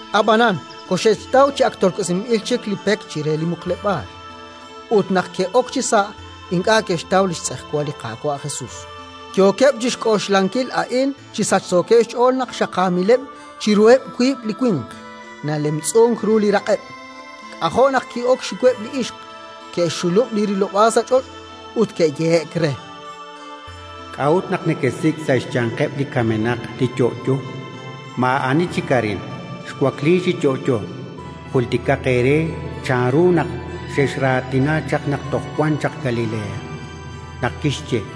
Ab'anan koxe'xtaw chi ak tolk'osinb'il chik li pek chire li muqleb'aal, ut, naq ke'ok chisa', ink'a' ke'xtaw li xtz'ejwal li Qaawa' Jesus. Yookeb' chi xk'oxlankil a'in chi sachsookeb' xch'ool naq xaqaamileb' chiruheb' wiib' li winq, nalemtz'unk ru li raq'eb'. K'ajo' naq ki'ok xxiweb' li ixq! Ke'xxulub' li rilob'aal sa' ch'och' ut ke'yehe'k re: —K'a'ut naq nekesik' sa' xyanqeb' li kamenaq li Yo'yo? Maa'ani chik arin: xwakliik chi yo'yo. Jultikaq eere chanru naq xexraatina naq toj wan chaq Galilea, naq kixye: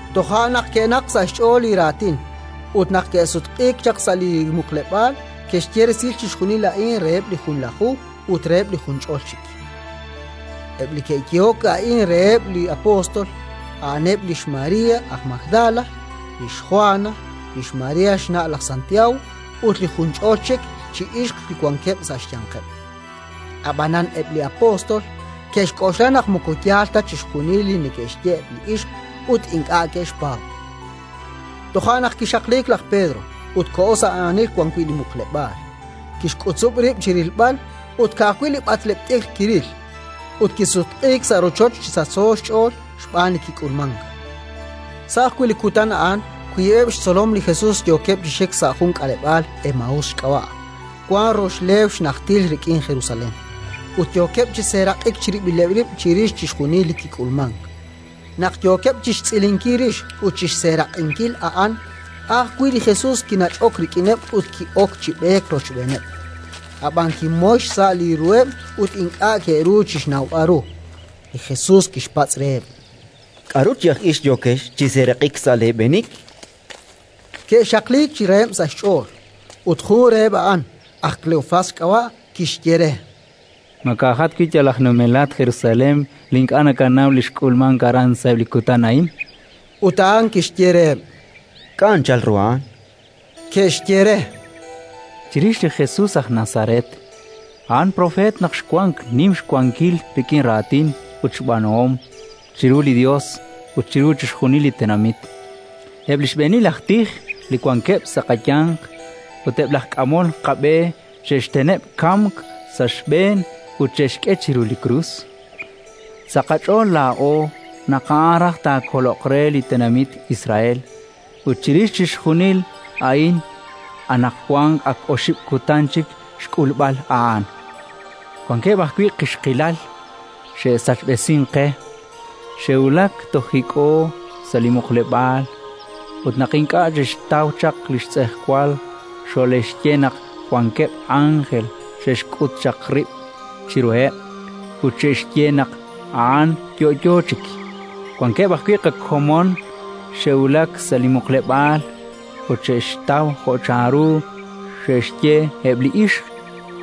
Toja' naq ke'naqk sa' xch'ool li raatin ut, naq ke'sutq'iik chaq sa' li muqleb'aal, ke'xye resil chixjunil a'in reheb' li Junlaju ut reheb' li junch'ol chik. Eb' li ke'yehok a'in reheb' li apóstol, a'aneb' lix María aj Magdala, lix Jwana, lix María xna' laj Santiago, ut li junch'ol chik chi ixq li wankeb' sa' xyanqeb'. Ab'anan eb' li apóstol ke'xk'oxla naq moko yaal ta chixjunil li neke'xye eb' li ixq, ut ink'a' ke'xpaab'. Toja' naq kixaqliik laj Pedro ut koho sa' aanil wan wi' li muqleb'aal; kixk'utzub' rib' chi rilb'al, ut ka'ajwi' li b'atleb' t'ikr kiril. Ut kisutq'iik sa' rochoch chi sachso xch'ool xb'aan li kik'ulmank. Sa' ajwi' li kutan a'an wiib'eb' li xtzolom li Jesus yookeb' chi xik sa' jun k'aleb'aal, Emaús xk'ab'a', wan rox leew xnajtil rik'in Jerusalén, ut yookeb' chi seeraq'ik chirib'ileb' rib' chirix chixjunil li kik'ulmank. Naq yookeb' chi xtz'ilinkil rix ut chi xseeraq'inkil a'an, a' ajwi' li Jesus kinach'ok rik'ineb' ut ki'ok chi b'eek rochb'eeneb'; ab'anan kimoyon xsa' li ruheb' ut ink'a' ke'ru chi xnawb'al ru. Li Jesus kixpatz' reheb': —K'aru chi aj ix yookex chi seeraq'ik sa' leeb'eenik? Ke'xaqliik chi raheb' sa' xch'ool, ut jun reheb' a'an, aj Kleofás xk'ab'a', kixye re: —Ma ka'jat wi' laa'at yal aj numelat Jerusalén li ink'a' nakanaw li xk'ulmank aran sa'eb' li kutan a'in? Ut a'an kixye reheb': —K'a' anchal ru a'an? Ke'xye re: —Chirix li Jesus aj Nazaret: a'an propeet naq xwank, nim xwankil rik'in raatin ut xb'aanuhom chiru li Yos ut chiru chixjunil li tenamit. Eb' li xb'eenil aj tij li wankeb' sa' qayanq ut eb' laj k'amol qab'e xe'xteneb' kamk sa' xb'een ut xe'xk'e chiru krus. Sa' qach'ool laa'o naq a'an raj taakoloq re li tenamit Israel. Ut chirix chixjunil a'in, anaqwan ak oxib' kutan chik xk'ulb'al a'an. Wankeb' ajwi' qixqilal xe'sachb'esink qe: xe'wulak toj hik'ho sa' li muqleb'aal ut, naq ink'a' xe'xtaw chaq li xtz'ejwal, xole'xye naq wankeb' ánjel xe'xk'ut chaq rib' chiruheb' ut xe'xye naq a'an yo'yo chik. Wankeb' ajwi' qakomon xe'wulak sa' li muqleb'aal ut xo'e'xtaw jo' chanru xe'xye eb' li ixq;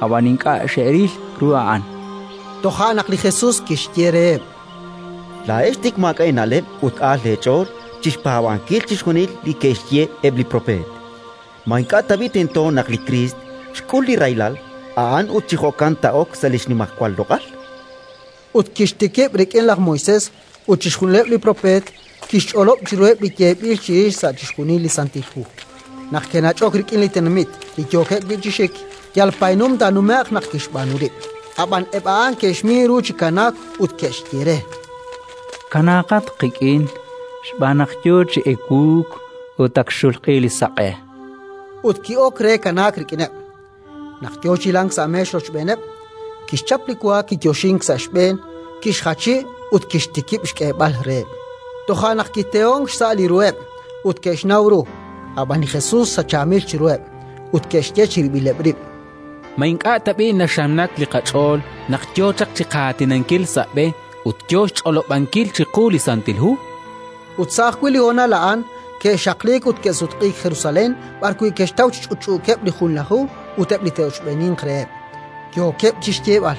ab'an ink'a' xe'ril ru a'an. Toja' naq li Jesus kixye reheb': —Laa'ex tik maak'a' eena'leb' ut aal leech'ool chi xpaab'ankil chixjunil li ke'xye eb' li propeet! Ma ink'a' tab'i' tento naq li Kriist xk'ul li rahilal a'an ut chi jo'kan taa'ok sa' li xnimajwal loq'al? Ut kixtikib' rik'in laj Moisés ut chixjunileb' li propeet, kixch'olob' chiruheb' li yeeb'il chirix sa' chixjunil li Santil Hu. Naq ke'nach'ok rik'in li tenamit li yookeb' wi' chi xik, yal paynum taanume'q naq kixb'aanu rib'. Ab'an eb' a'an ke'xmin ru chi kanaak ut ke'xye re: —Kanaaqat qik'in, xb'aan naq yo chi ewuuk ut ak xxulq'i li saq'e. Ut ki'ok re kanaak rik'ineb'. Naq yo chi hilank sa' meex rochb'eeneb', kixchap li wa, kiyoxink sa' xb'een, kixjachi ut kixtikib' xk'eeb'al reheb'. Toja' naq kitehonk xsa' li ruheb' ut ke'xnaw ru; ab'an li Jesus sachaamil chiruheb'. Ut ke'xye chirib'ileb' rib': —Ma ink'a' tab'i' naxamnak li qach'ool naq yo chaq chi qaatinankil sa' b'e ut yo xch'olob'ankil chiqu li Santil Hu? Ut sa' ajwi' li honal a'an ke'xaqliik ut ke'sutq'iik Jerusalén b'arwi' ke'xtaw chi ch'utch'uukeb' li Junlaju ut eb' li te'ochb'eeninq reheb', yookeb' chi xyeeb'al: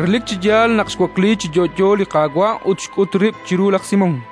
—Relik chi yaal naq xwakliik chi yo'yo li Qaawa' ut xk'ut rib' chiru laj Simón!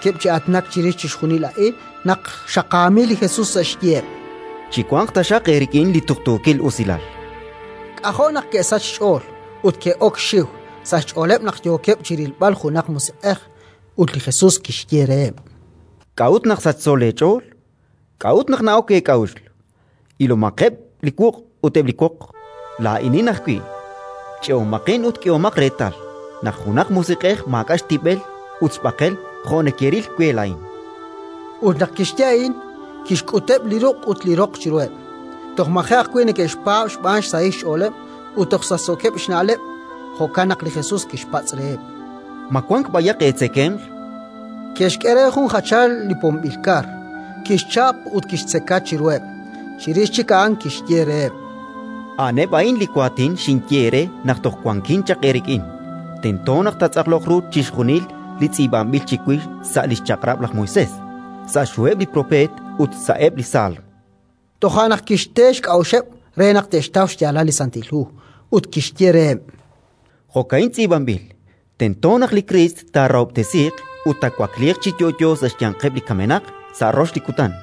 Yookeb' chi aatinak chirix chixjunil a'in naq xaqaamil li Jesus sa' xyiheb': —Chiwanq taxaq eerik'in li tuqtuukil usilal, chan reheb'. K'ajo' naq ke'sachk xch'ool ut ke'ok xxiw; sa' xch'ooleb' naq yookeb' chi rilb'al junaq musiq'ej. Ut li Jesus kixye reheb': —K'a'ut naq sachso leech'ool? K'a'ut naq na'ok eek'a'uxl? Ilomaqeb' li wuq' ut eb' li woq: laa'inin ajwi'! Ch'e'omaqin ut k'ehomaq reetal naq junaq musiq'ej maak'a' xtib'el ut xb'aqel jo' nekeril we laa'in. Ut naq kixye a'in, kixk'uteb' li ruq' ut li roq chiruheb'. Toj maji' ajwi' neke'xpaab' xb'aan xsahil xch'ooleb' ut toj sachsookeb' xna'leb'; jo'kan naq li Jesus kixpatz' reheb': —Ma wank b'ayaq eetzekemq? Ke'xk'e re jun jachal li pomb'il kar. Kixchap ut kixtzeka chiruheb'. Chirix chik a'an kixye reheb': —A'aneb' a'in li waatin xinye eere naq toj wankin chaq eerik'in: Tento naq taatz'aqloq ru chixjunil li tz'iib'anb'il chiwix sa' li xChaq'rab' laj Moisés, sa' xHuheb' li Propeet ut sa'eb' li Saalm. Toja' naq kixte xk'a'uxeb' re naq te'xtaw xyaalal li Santil Hu. Ut kixye reheb': —Jo'ka'in tz'iib'anb'il: «Tento naq li Kriist taarahob'tesiiq ut taawakliiq chi yo'yo sa' xyanqeb' li kamenaq sa' rox li kutan;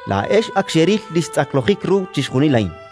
Laa'ex ak xeril li xtz'aqlojik ru chixjunil a'in.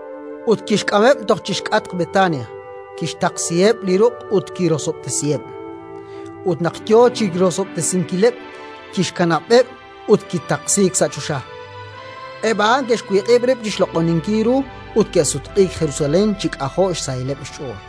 Ut kixk'ameb' toj chi xk'atq Betania; kixtaqsiheb' li ruq' ut kirosob'tesiheb'. Ut naq yo chi rosob'tesinkileb', kixkanab'eb' ut kitaqsiik sa' choxa. Eb' a'an ke'xwiq'ib' rib' chi xloq'oninkil ru ut ke'sutq'iik Jerusalén chi k'ajo' xsahilaleb' xch'ool.